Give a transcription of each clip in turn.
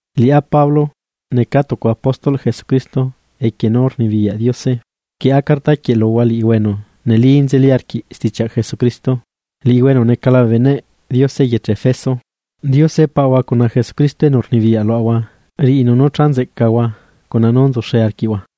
Liꞌá Pablo, necaa tucu apóstol Jesucristo equie nú rnibiyaꞌ Diose. Rquieꞌa carta quieꞌ luhua liꞌihua enu neli nzeli arquiꞌ stichiaꞌ Jesucristo, liꞌihua enu necala bee beneꞌ Diose eyeche Efeso. Diose Paꞌahua cuna Jesucristo enu rnibiyaꞌ luaꞌahua riꞌinu nú cha nzeꞌcahua cuna nú nzuxe arquiꞌhua.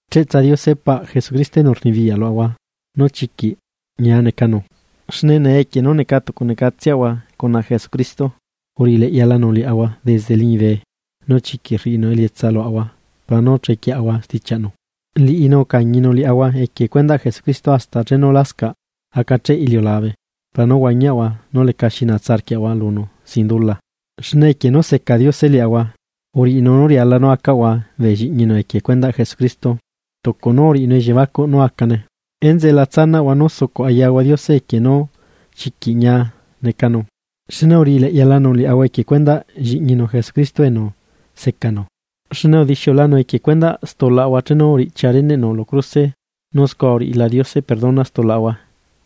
Cheꞌtsa Diose paꞌ Jesucristo enu rnibiyaꞌ luaꞌahua nú chiquiꞌ ñia necanu, xne nee equie nú neca tucunecatseꞌahua cuna Jesucristo, uriꞌileꞌyalanu liaꞌahua desde liñibe nu chiquiꞌ rriꞌinu elietsa luaꞌahua para nú chequieꞌahua stichiaꞌnu. Liꞌinu ucañinu liaꞌahua equie cuendaꞌ Jesucristo hasta chenu lascaꞌ acacheꞌ iliulabe para nú huañiaꞌahua nu lecaxi naꞌahua lunu sin dula, xne equie nú seca Diose liaꞌahua, uriꞌinu nú riala nú acaꞌahua bee lliꞌñinu equie cuendaꞌ Jesucristo, tucu nú uriꞌinu elliebacuꞌ nú acane. Enzeꞌe, la tsanaꞌahua nú sucuꞌ ayaꞌahua Diose equie nú chiquiꞌ ñia necanu, xne uriꞌi leꞌyalanu liaꞌahua equie cuendaꞌ Lliꞌñinu Jesucristo enu secanu. Xne udixiulanu equie cuendaꞌ stulaꞌahua chenu uriꞌchia reneꞌnu lu cruse nu scua uriꞌila Diose perdona stulaꞌahua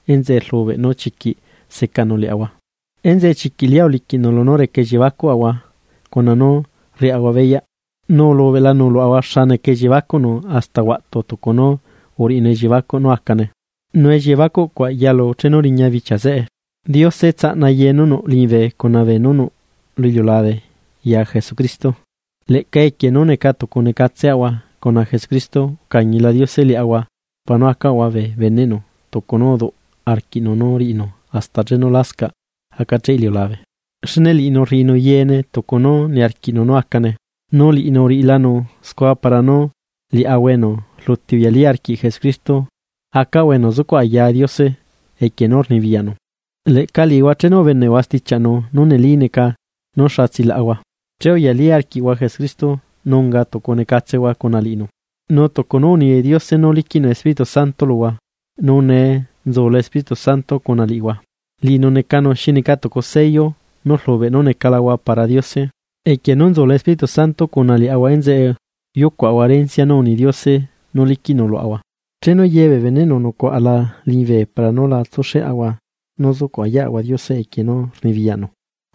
enzeꞌe rlubeꞌ nú chiquiꞌ secanu liaꞌahua. Enzeꞌe chiquiꞌ lia uliquiꞌnu lunú reca elliebacuꞌahua cuna nú rriaꞌahua beyaꞌ, nu ulubeꞌlanu luaꞌahua xa neca elliebacuꞌnu hasta huaꞌtu tucu nú uriꞌinu elliebacuꞌ nú acane. Nu elliebacuꞌcuaꞌ tsalunu chenu riña bichia zeꞌe, Diose tsaꞌna ye nú nuꞌ liñibe cuna beenú nuꞌ lu iliulabe ya Jesucristo. Leꞌca equie nú neca tucu necaꞌtseꞌahua cuna Jesucristo, ucañila Diose liaꞌahua para nú acaꞌahua bee beneꞌnu tucu nú uduꞌ arquiꞌnu nú riꞌinu hasta chenu lasca acacheꞌ iliulabe, xne liꞌinu rrinu yeene tucu nú niarquiꞌnu nú acane. Nu liꞌinu uriꞌilanu scua para nú liaꞌahua enu rluti uyalí arquiꞌ Jesucristo, acaꞌahua enu zucuꞌ ayaa Diose equie nú rnibiyaꞌnu. Leꞌca liꞌihua chenu ubeneꞌhua stichiaꞌnu nú neli neca nú xa tsilaꞌahua, che uyalí arquiꞌhua Jesucristo nu unga tucu necatsehua cuna liꞌinu. Nu tucu nú uni Diose nú liquiꞌnu Espíritu Santo luhua, nu nee nú nzula Espíritu Santo cuna liꞌihua, liꞌinu necanu xi neca tucu sello nú rlubeꞌ nú necalahua para Diose. Equie nú nzula Espíritu Santo cuna liaꞌahua enzeꞌe yucuaꞌahua erencia nú uni Diose nú liquiꞌnu luaꞌahua, chenu ye bee beneꞌnu nucuaꞌala liñibe para nú la tsuxeꞌahua nú sucuꞌ ayaꞌahua Diose equie nú rnibiyaꞌnu.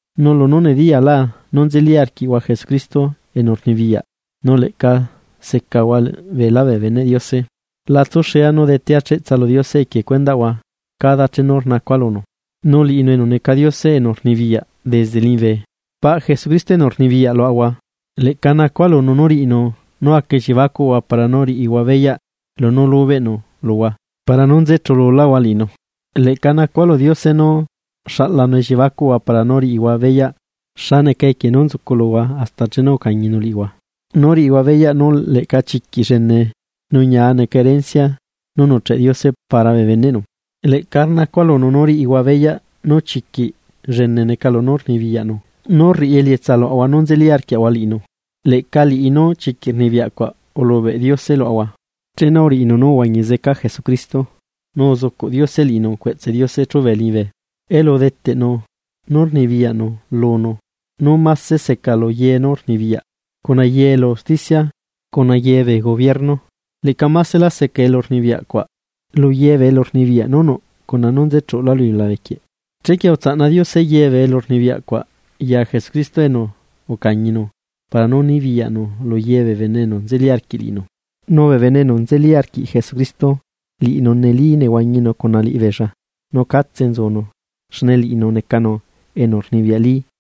Nu lunú nediyala nú nzeli arquiꞌhua Jesucristo enu rnibiyaꞌ, nu leꞌca secahua beelá bee beneꞌ Diose, la tsuxea nú rdetea cheꞌtsa lu Diose equie cuendaꞌhua cada chenu rnacua lunu. Nu liꞌinu enu neca Diose enu rnibiyaꞌ desde liñibe, nu liꞌinu necanu paꞌ Jesucristo enu rnibiyaꞌ luaꞌahua. Leꞌca nacua lunu nú riꞌinu nú aca elliebacuꞌhua para nú riꞌihua beyaꞌ lunú lubeꞌnu luhua para nú nze chululáhua liꞌinu. Leꞌca nacua lu Diose nú xaꞌlanu elliebacuꞌhua para nú riꞌihua beyaꞌ xa neca equie nú nzuculuhua hasta chenu ucañinu liꞌihua nu riꞌihua beyaꞌ nú leꞌca chiquiꞌ llene nu ñia neca erencia nú nuꞌcheꞌ Diose para bee beneꞌnu. Leꞌca rnacua lunu nú riꞌihua beyaꞌ nú chiquiꞌ llene neca poder, nú rriꞌi elietsa luaꞌahua nú nzeli arquiaꞌahua liꞌinu. Leꞌca liꞌi poder llenecuaꞌ nú chiquiꞌ ulubeꞌ Diose luaꞌahua, chenu uriꞌinu nú uhuañi zeca Jesucristo, nu uzucuꞌ Diose liꞌinu cueꞌtse Diose chubee liñibe, elu udeteꞌnu nú rnibiyaꞌnu lunu nú máse seca lu ye elu rnibiyaꞌ, cuna ye elu usticia cuna ye bee gobierno. Leꞌca másela seca elu rnibiyaꞌcuaꞌ lu ye bee elurnibiyaꞌ nú nuꞌ cuna nú nze chuꞌulá lu iliulabe quieꞌ. Chequie utsaꞌna Diose ye bee elurnibiyaꞌ cuaꞌ ya Jesucristo enu ucañinu para nú nibiyaꞌnu lu ye bee bene enu nzeli arquiꞌ liꞌinu. Nu bee bene enu nzeli arquiꞌ Jesucristo, liꞌinu neli nehuañinu cuna liꞌibeella nu catse nzunu xne liꞌinu necanu enu rnibiyaꞌli.